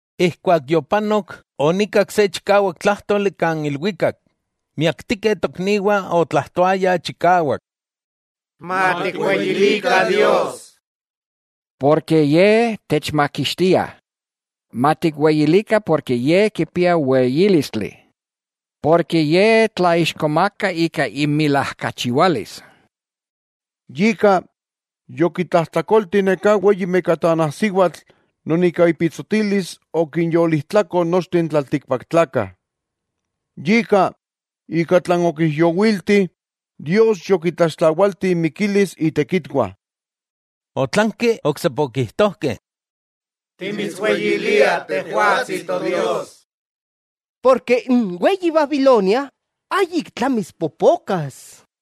Ijkuak yopanok, onikak se chikawak tlájtoli kan ilwikak, miaktikeh tokniwah otlajtoayah chikawak: ¡Matikweyilikah Dios!, ken Ye techmakixtia. Matikweyilikah ken Ye kipia weyílistli. Ye tlaixkomaka ika imilajkachiwalis. Yika, yokitlajtlakolti neká weyi mekatanajsiwatl non ika ipitsotilis okinyolijtlako nochteh n tlaltikpaktlakah. Yika ika tlan okijyowilti Dios yokitlaxtlawalti inmikilis itekitwah. Otlanki oksepa okijtojkeh: —¡Timitsweyiliah Tejwatsi Todios! Porke n weyi Babilonia ayik tlamis popokas.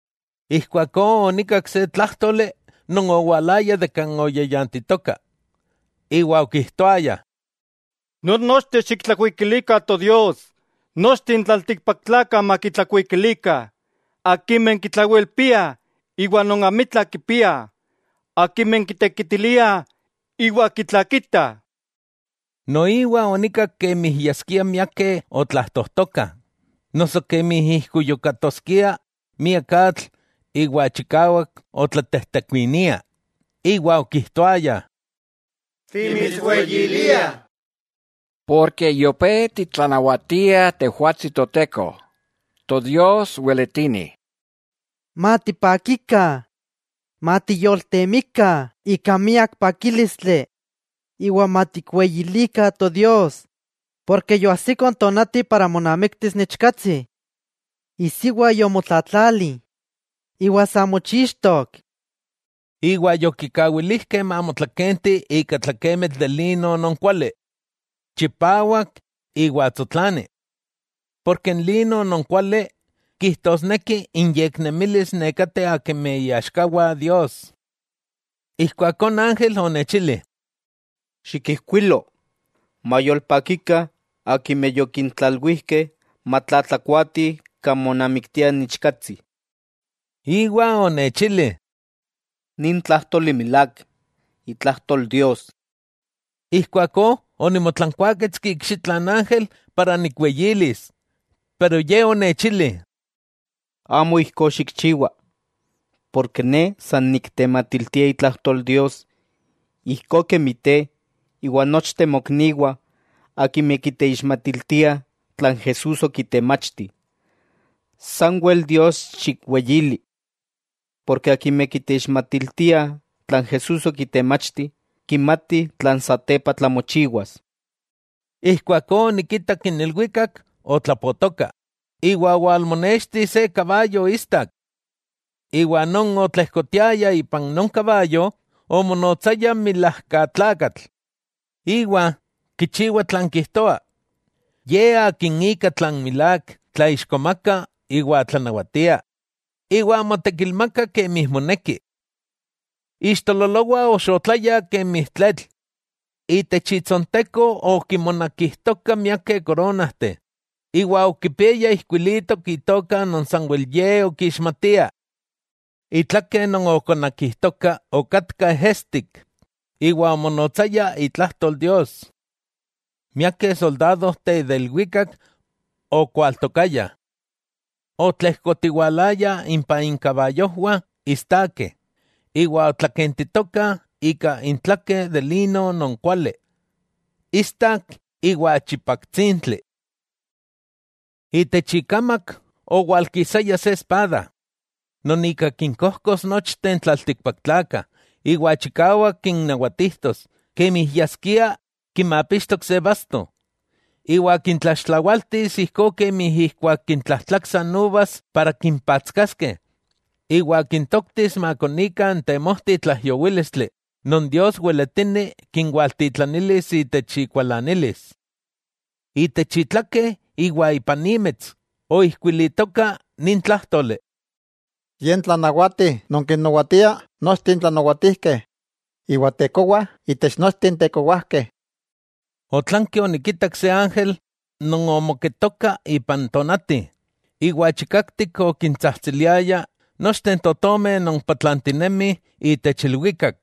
Ijkuakó onikak se tlájtoli non owalaya de kan oyayantitoka, iwa okijtoaya: ¡Nonnochteh xiktlakuikilikah Todios nochteh n tlaltikpaktlakah makitlakuikilikah, akimeh kitlawelpiah iwa non próbesteh, akimeh kitekitiliah iwa akimeh kitlakitah! Noiwa onikak kemi yaskia miakeh otlajtojtokah, noso kemi ijkuyukatoskia miak atl iwa chikawak otlatejtekuinia, iwa okijtoayah: ¡Timitsweyiliah!, ken yopé titlanawatia Tejwatsi Toteko, Todios weletini. Matipakikah, matiyoltemikah ika miak pakílistli iwa matikweyilikah Todios, ken yoajsiko n tonati monamiktis n Ichkatsi. Isiwa yomotlatlali iwa sa mochixtok. Iwa yokikawilijkeh mamotlakenti ika tlakemitl de lino non kuali, chipawak iwa tsotlani. N lino non kuali, kijtosneki inyeknemilis nekateh akimeh iaxkawah Dios. Ijkuakó n ángel onechili: —Xikijkuilo: “Mayolpakikah akimeh yokintlalwijkeh matlatlakuatih kan monamiktia n Ichkatsi.” Iwa onechili: —Nin tlájtoli milák, itlajtol Dios. Ijkuakó onimotlankuaketski ikxitla n ángel para nikweyilis, iwa ye onechili: —Amo ijkó xikchiwa. Ne san niktematiltia itlajtol Dios ijkó kemi te iwa nochteh mokniwah akimeh kiteixmatiltiah tlan Jesús okitemachti. Sanwel Dios xikweyili. Porke akimeh kiteixmatiltiah tlan Jesús okitemachti, kimatih tlan satepa tlamochiwas. Ijkuakó onikitak n ilwikak otlapotoka, iwa owalmonexti se kabayo istak. Iwa non otlejkotiaya ipan non kabayo, omonotsaya Milajkatlakatl iwa Kichiwa Tlan Kijtoa, Ye Akin ika tlan milák tlaixkomaka iwa tlanawatia, iwa motekilmaka kemi moneki. Ixtololowah oxotlayah kemi tletl, itech itsonteko okinmonakijtoka miakeh koronajteh, iwa okipiaya ijkuilitok itoka non sanwel ye okixmatia. Itlake non okonakijtoka okatka ejestik, iwa omonotsaya Itlajtol Dios. Miakeh soldadojteh de ilwikak okwaltokayah. Otlejkotiwalayah impah inkabayojwah istakeh, iwa otlakentitokah ika intlakeh de lino non kuali, istak iwa chipaktsintli. Itech ikamak owalkisaya se espada, non ika kinkojkos nochteh n tlaltikpaktlakah, iwa chikawak kinnawatijtos kemi yaskia kimapixtok se basto. Iwa kintlaxtlawaltis ijkó kemi ijkuak kintlajtlaksah n uvas para kimpatskaskeh, iwa kintoktis makonikah n temojti tlaijyowílistli non Dios weletini kinwaltitlanilis itech ikualanilis. Itech itlake iwa ipan imets, oijkuilitoka nin tlájtoli: “Ye n tlanawati non kinnawatia nochteh n tlanawatijkeh iwa Tekowa itech nochteh n tekowajkeh.” Otlanki onikitak se ángel non omoketoka ipan tonati, iwa chikaktik okintsajtsiliaya nochteh n totomeh non patlantinemih itech ilwikak: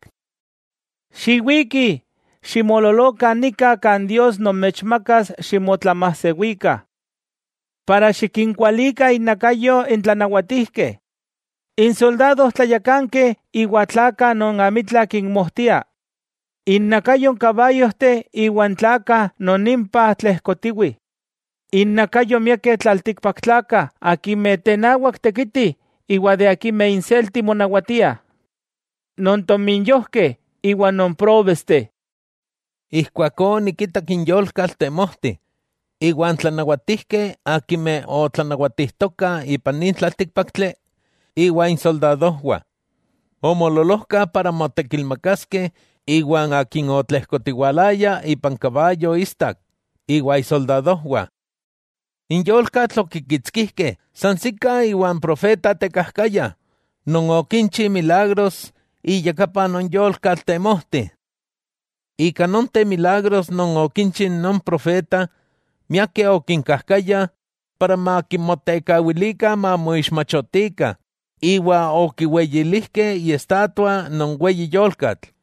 —¡Xiwikih!, ximoololokah nika kan Dios nomechmakas ximotlamajsewikah, iwa xikinkualikah innakayo n tlanawatijkeh, n soldadojtlayakankeh iwa tlakah non amitla kinmojtia, innakayo n kabayojteh iwa n tlakah non impah tlejkotiwih, innakayo miakeh tlaltikpaktlakah akimeh tenawak tekitih iwa akimeh inselti monawatiah, non tominyojkeh iwa non próbesteh. Ijkuakó onikitak n yolkatl temojti, iwa n tlanawatijkeh akimeh otlanawatijtokah ipan nin tlaltíkpaktli iwa insoldadojwah. Omoololojkah para motekilmakaskeh iwa Akin otlejkotiwalaya ipan ikabayo istak iwa isoldadojwah. N yolkatl okikitskijkeh, sansikah iwa n profeta tekajkaya non okinchi milagros iyakapa non yolkatl temojti. Ika nonteh milagros non okinchi non profeta, miakeh okinkajkaya para makimotekawilikah mamoixmachotikah iwa okiweyilijkeh iestatua non weyi yolkatl,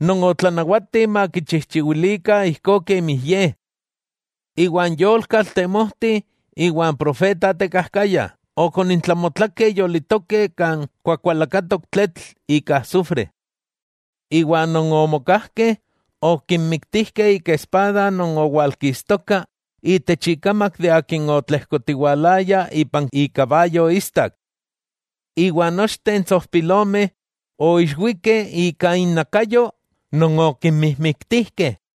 non otlanawati makichijchiwilikah ijkó kemi ye. Iwa n yolkatl temojti iwa n profeta tekajkaya, okonintlamotlakeh yolitokeh kan kuakualakatok tletl ika asufre. Iwa non omokajkeh, okimiktijkeh ika espada non owalkistoka itech ikamak de Akin otlejkotiwalaya ipan ikabayo istak. Iwa nochteh n tsojpilomeh oijixwikeh ika innakayo non okimijmiktijkeh.